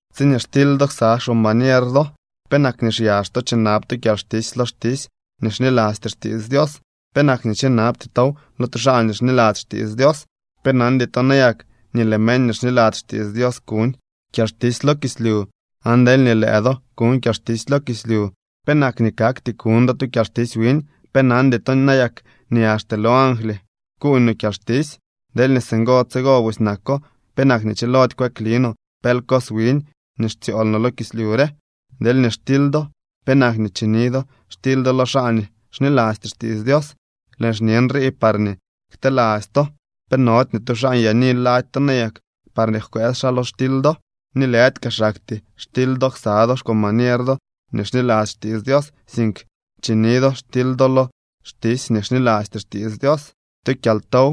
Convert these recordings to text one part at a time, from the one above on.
Tsiñee xtily do ksa xcombañer do, ¿penak nii xyax to chinab to kyalxtisy lo xtisy nii xnilasty xtiits Dios? ¿Penak nii chinabty tow lo tu xaa nii xniladzy xtiits Dios? ¿Pe nandy to nayak nii lëë meñ nii xniladzy xtiits Dios kuñ kyalxtisy lo kislyu? Aan deelñee lëë do kuñ kyalxtisy lo kislyu ¿penak nii kakty kuñ do tu kyalxtisy wiñ? ¿Pe nandy to nayak nii axte lo angly kuuñ no kyalxtisy? Deelñee singo tsigo busy nako, ¿penak nii chilody kweekli no pel cos wiñ nii xtsyool no lo kislyu re? Deelñee xtily do ¿penak nii chini do xtily do lo xaa nii xnilasty xtiits Dios? Lëën xñe nrii parñee kteladzy to. ¿Pe nody ni tu xaa nyaani lady to nayak parñee jkwëës xaa lo xtily do? Ni lëdy kaa xaktyee xtily do ksa do xcombañer do nii xniladzy xtiits Dios, sink chini do xtily do lo xtisy nii xnilasty xtiits Dios. Tu kyaltow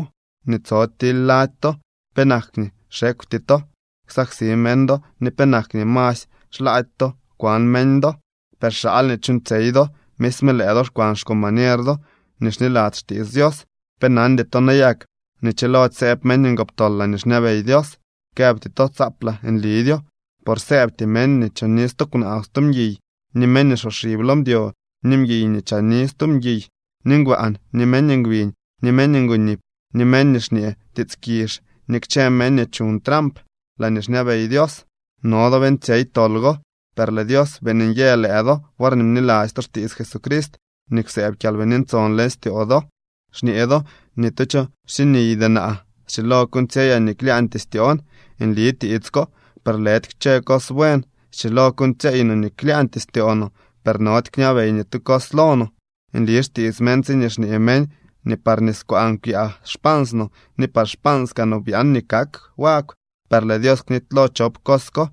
nii tso tily lady to. ¿Penak nii xekwty to ksaksi meñ do ni penak nii masy xlaady to kwan meñ do? Per xaal nii chuuñtsyey do, misme lëë do xkwan xcombañer do nii xniladzy xtiits Dios. ¿Pe nandy to nayak nii chilody sëëb meñ ngoptol laañee xñabey Dios? Këbty to tsaaplaa nlidyo, por sëëbty meñ nii choni stu kwnaa o stu mguiy, ni meñ nii xsoxib lo mdyo, ni mguiy nii chaani stu mguiy, ni ngbaan, ni meñ ngbiñ, ni meñ ngonip, ni meñ nii xñee tiits kizh ni kchë meñ nii chuñ tramp laañee xñabey Dios. No do beeñtsyey tol go, per lëë Dios beeñ nyë lëë do worñee bniladzy to xtiits Jesucrist ni kwsëëb Kyalbini Ntson leñ styoo do. Xñee do ni tu cho xsiniydy naa. Schilo kuuñtsyeyaa nii klyaañtyee styoon. Nli tiits ko, per lëdy kchë cos buen. Schilo kuuñtsyeey no nii klyaañtyee styoo no, per nody kñabey ni tu cos lo no. Nli xtiits meñ tsiñee xñee meñ nii par niskwaan kwyaa xpans no ni par xpaans kaa no byaan nii kak wagw, per lëë Dios knitylo chop cos ko.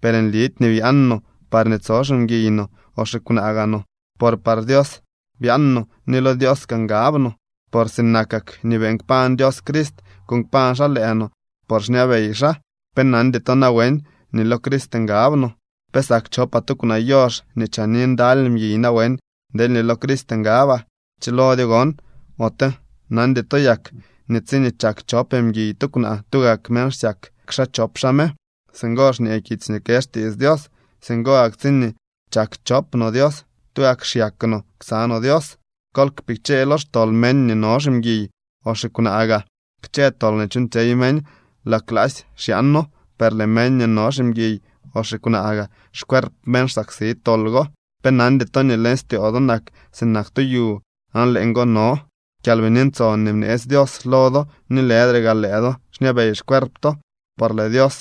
Per nlidy nii byaan no parñee tso ximguiy no o xikwnaa gaa no, por par Dios byaan no ni lo Dios kaa ngab no. Por sinakak nii beeñ kpañ Dios Crist, kuuñ kpañ xaa lëë no por xñabey xaa. ¿Pe nandy to nawen nii lo Crist ngab no? ¿Pe sak chopaa tu kwnaa yox nii chaani ndaly mguiy nawen deelñee lo Crist ngabaa? ¡Chilodyo gon! ¿Ote nandy to yak nii tsiñee chak chop mguiy tu kwnaa tugak meñ xyak xaa chop xaa me? Singo xñee kitsy nii kë xtiits Dios. Singo gak tsiñee chak chop no Dios, tugak xyak no ksa no Dios. Kol kpichee lo xtol meñ nii no ximguiy o xikwnaa gaa. Kchë tol nii chuuñtsyey meñ laa klaasy xyaano, per lëë meñ nii no ximguiy o xikwnaa gaa, xcuerp meñ xsaksi tol go. ¿Pe nandy to nii leñ styoo do nak sinak tu yu aan leeñgo no Kyalbini Ntson nii bneetsy Dios lo do ni lëdre gaa lëë do xñabey xcuerp to? Por lëë Dios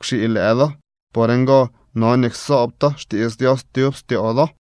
kwxii lëë do. Por ngo no nii ksoob to xtiits Dios tyub styoo do.